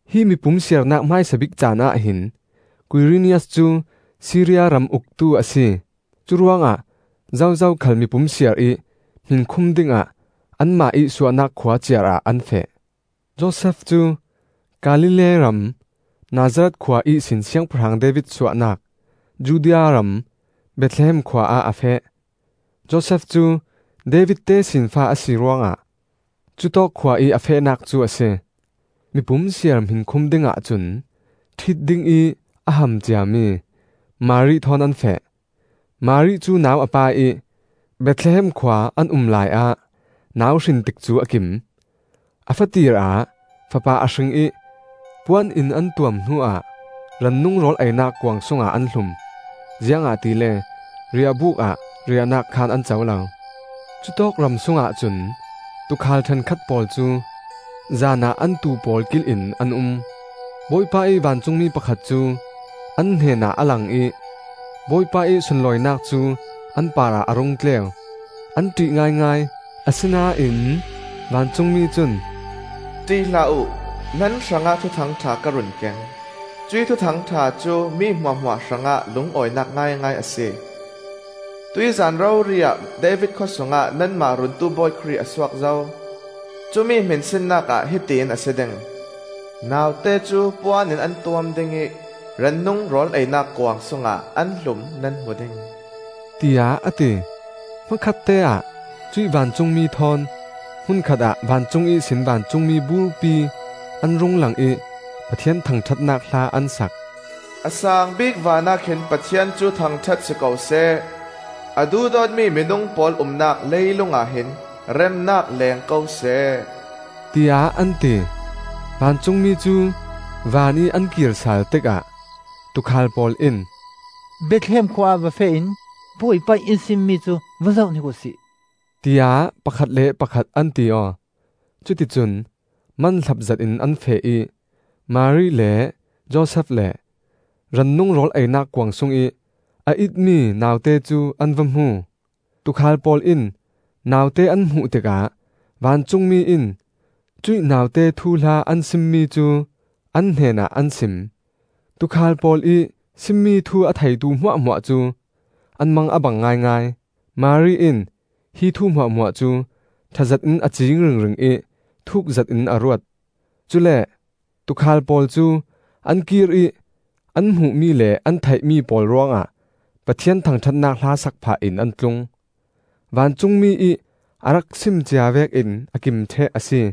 Hi mipum siarnak hmaisa bik caanah hin Kuirinias cu Siria ram uktu a si. Curuangah zozo khal mipum siar ih hminkhum dingah anmah ih suahnak khua ciarah an feh. Josef cu Galilee ram Nazareth khua ihsin Siangpahrang David suahnak Judea ram Bethlehem khua ah a feh. Josef cu David tesinfa a si ruangah cutawk khua ih a fehnak cu a si. Mipum siar hminkhum dingah cun ṭhit dingih a ham ciami Mari thawn an feh. Mari cu nau a pai ih, Bethlehem khua an um laiah nau hrin tikcu a kim. A fatir ah fapa a hring ih puan in an tuam hnuah rannung rawl einak kuang sungah an hlum; ziangahtile riahbuk ah riahnak khaan an co lo. Cutawk ram sungah cun tuukhal ṭhenkhat pawl cu zanah an tuu pawl kil in an um. Bawipa ih vancungmi pakhat cu an hnenah a lang ih Bawipa ih sunlawinak cu an parah a rung tleu. An ṭih ngaingai; asinain vancungmi cun, “ṭih hlah uh! Nan hrangah thuthang ṭha ka run keng; cuih thuthang ṭha cu mi hmuahhmuah hrangah lungawinak ngaingai a si. Tuih zan rori ah David khawsungah nanmah Runtu Bawi Khrih a suak zo. Cumi hminsinnak ah hiti in a si ding: naute cu puan in an tuam ding ih rannung rawl einak kuang sungah an hlum nan hmu ding,” tiah a ti. Hmakhatteah cuih vancungmi thawn hmun khatah vancung ihsin vancungmi burpi an rung lang ih Pathian thangṭhatnak hla an sak. “A saang bik vanah khin Pathian cu thangṭhat si ko seh; A duhdawtmi minung pawl umnak leilungah hin remnak leeng ko seh,” tiah an ti. Vancungmi cu vanih an kirsal tikah tuukhal pawl in, “Bethlehem khua ah va feh in Bawipa ih in simmi cu va zohhnik uhsi,” tiah pakhat le pakhat an ti aw. Cuticun manhlap zetin an feh ih Mari le Josef le rannung rawl einak kuang sungih a itmi naute cu an va hmu. Tuukhal pawl in naute an hmuh tikah vancungmi in cuih naute thuhla an simmi cu an hnenah an sim. Tuukhal pawl ih simmi thu a theitu hmuahhmuah cu an mang a bang ngaingai. Mari in hi thu hmuahhmuah cu ṭhazet in a ciing ringring ih thuk zetin a ruat. Cule tuukhal pawl cu an kir ih an hmuhmi le an theihmi pawl ruangah Pathian thangṭhatnak hla sak phah in an tlung. Vancungmi ih a rak sim cia vekin a kim ṭheh a si.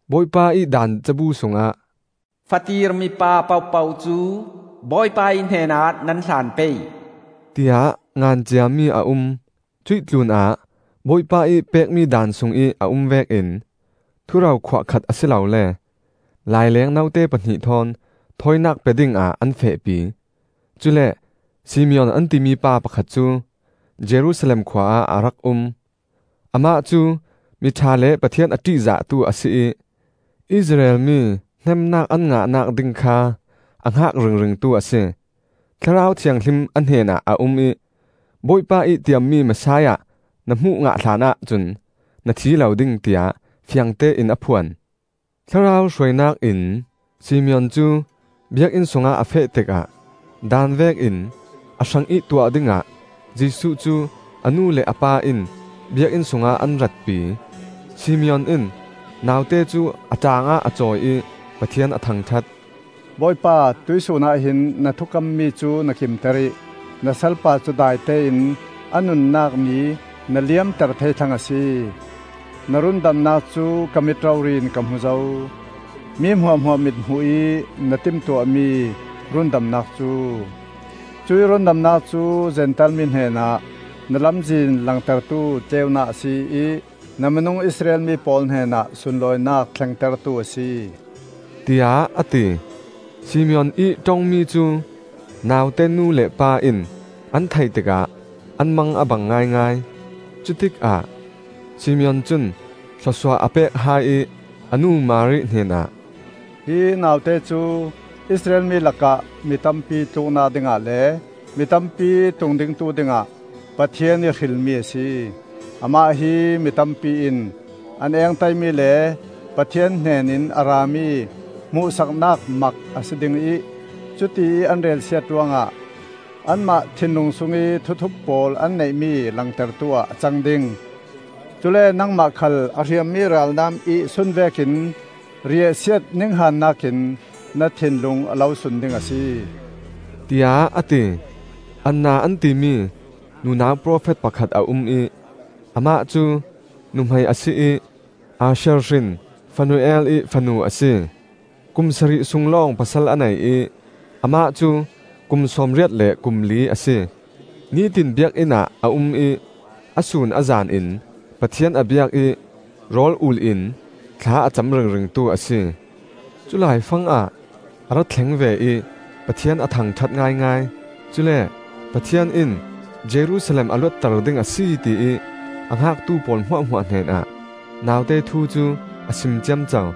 Bawipa ih daan cabu sungah, “Fatir mipa pohpoh cu Bawipa ih hnenah nan hlan pei,” tiah ngan ciami a um. Cuih tlunah Bawipa ih pekmi daan sungih a um vekin thuro khuah khat a si lole laileng note pahnih thawn thawinak pe dingah an fehpi. Cule Simeon an ti mipa pakhat cu Jerusalem khua ah a rak um. Amah cu mi ṭha le Pathian a ṭihzahtu a si ih Israel mi hneemnak an ngahnak ding kha a hngak ringringtu a si. Thlarau Thianghlim a hnenah a um ih, “Bawipa ih tiammi Messiah na hmuh ngah hlanah cun na thi lo ding,” tiah fiangtein a phuan. Thlarau hruainak in Simeon cu Biakinn sungah a feh tikah daan vekin a hrangih tuah dingah Jesuh cu a nu le a pa in Biakinn sungah an ratpi. Simeon in naute cu a ṭaangah a cawi ih Pathian a thangṭhat, “Bawipa, tuihsun ah hin na thukammi cu na kimter ih, Na salpa cu daitein a nunnak ni na liamter thei thlang a si. Na rundamnak cu ka mit rori in ka hmu zo; Mi hmuahhmuah mit hmuh ih na timtuahmi rundamnak cu! Cuih rundamnak cu Zentail mi hnenah na lamzin langtertu tleunak a si ih, Na minung Israel mi pawl hnenah sunlawinak thlengtertu a si,” tiah a ti. Simeon ih ṭongmi cu naute nu le pa in an theih tikah an mang a bang ngaingai. Cutikah Simeon cun thlawsuah a pek hai ih a nu Mari hnenah, “Hi naute cu Israel mi lakah mi tampi tluknak dingah le mi tampi tungdingtu dingah Pathian ih hrilmi a si. Amah hi mitampi in an engtaimi le Pathian hnenin a rami hmuhsaknak mak a si ding ih, cutiih an relsiat ruangah anmah thinlung sungih thuthup pawl an neihmi langtertu ah a cang ding. Cule nangmah khal a hriammi ralnam ih sun vekin riahsiat ninghannak in na thinlung a lo sun ding a si,” tiah a ti. Anna an timi nunau profet pakhat a um ih amah cu nuhmei a si ih Asher hrin Fanuel ih fanu a si. Kum sarih sung lawng pasal a nei ih, amah cu kum sawmriat le kum li a si. Nitin Biakinn ah a um ih a sun a zan in Pathian a biak ih rawl-ul in thla a cam ringringtu a si. Culaifang ah a ra thleng ve ih Pathian a thangṭhat ngaingai. Cule Pathian in Jerusalem a luatter ding a si ti ih a hngaktu pawl hmuahhmuah hnenah naute thu cu a sim ciamco.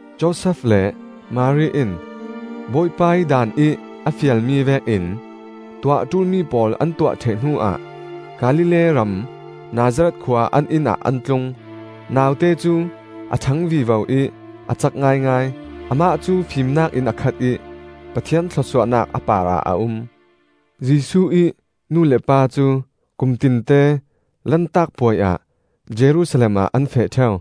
Josef le Mari in Bawipa ih daanih a fialmi vekin tuah ṭulmi pawl an tuah ṭheh hnu ah Galilee ram Nazareth khua an inn ah an tlung. Naute cu a ṭhang vivo ih a cak ngaingai. Amah cu fimnak in a khat ih Pathian thlawsuahnak a parah a um. Jesuh ih nu le pa cu kumtinte Lantak Puai ah Jerusalem ah an feh ṭheu.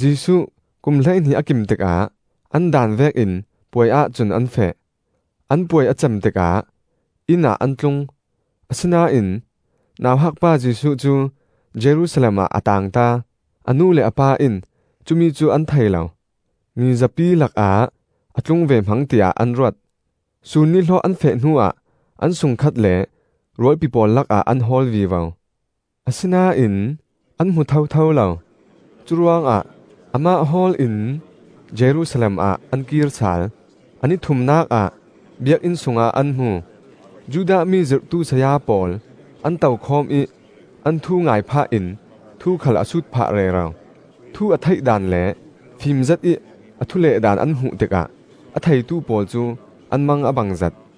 Jesuh kum hleihnih a kim tikah an daan vekin puai ahcun an feh. An puai a cem tikah inn ah an tlung, asinain nauhak pa Jesuh cu Jerusalem ah a taangta. A nu le a pa in cumi cu an thei lo; mizapi lakah a tlung ve hmang tiah an ruat. Sun nihlawh an feh hnuah an sungkhat le rualpi pawl lakah an hawl vivo. Asinain an hmu thotho lo; curuangah amah hawl in Jerusalem ah an kir sal. A ni thumnak ah Biakinn sungah an hmu. Judah mi zirhtu saya pawl an tokhawm ih an thu ngai phah in thu khal a sut phah rero. Thu a theih daan le fim zetih a thu leh daan an hmuh tikah a theitu pawl cu an mang a bangzet.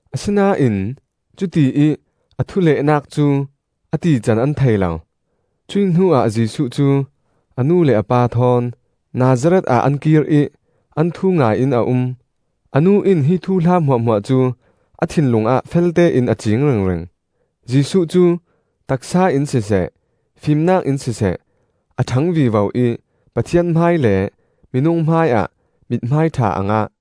Asinain cutiih a thu lehnak cu a tican an thei lo. Cuih hnuah Jesuh cu a nu le a pa thawn Nazareth ah an kir ih an thu ngai in a um. A nu in hi thuhla hmuahhmuah cu a thinlung ah feltein a ciing ringring. Jesuh cu taksa in siseh, fimnak in siseh a ṭhang vivo ih Pathian hmai le minung hmaiah mithmai ṭha a ngah.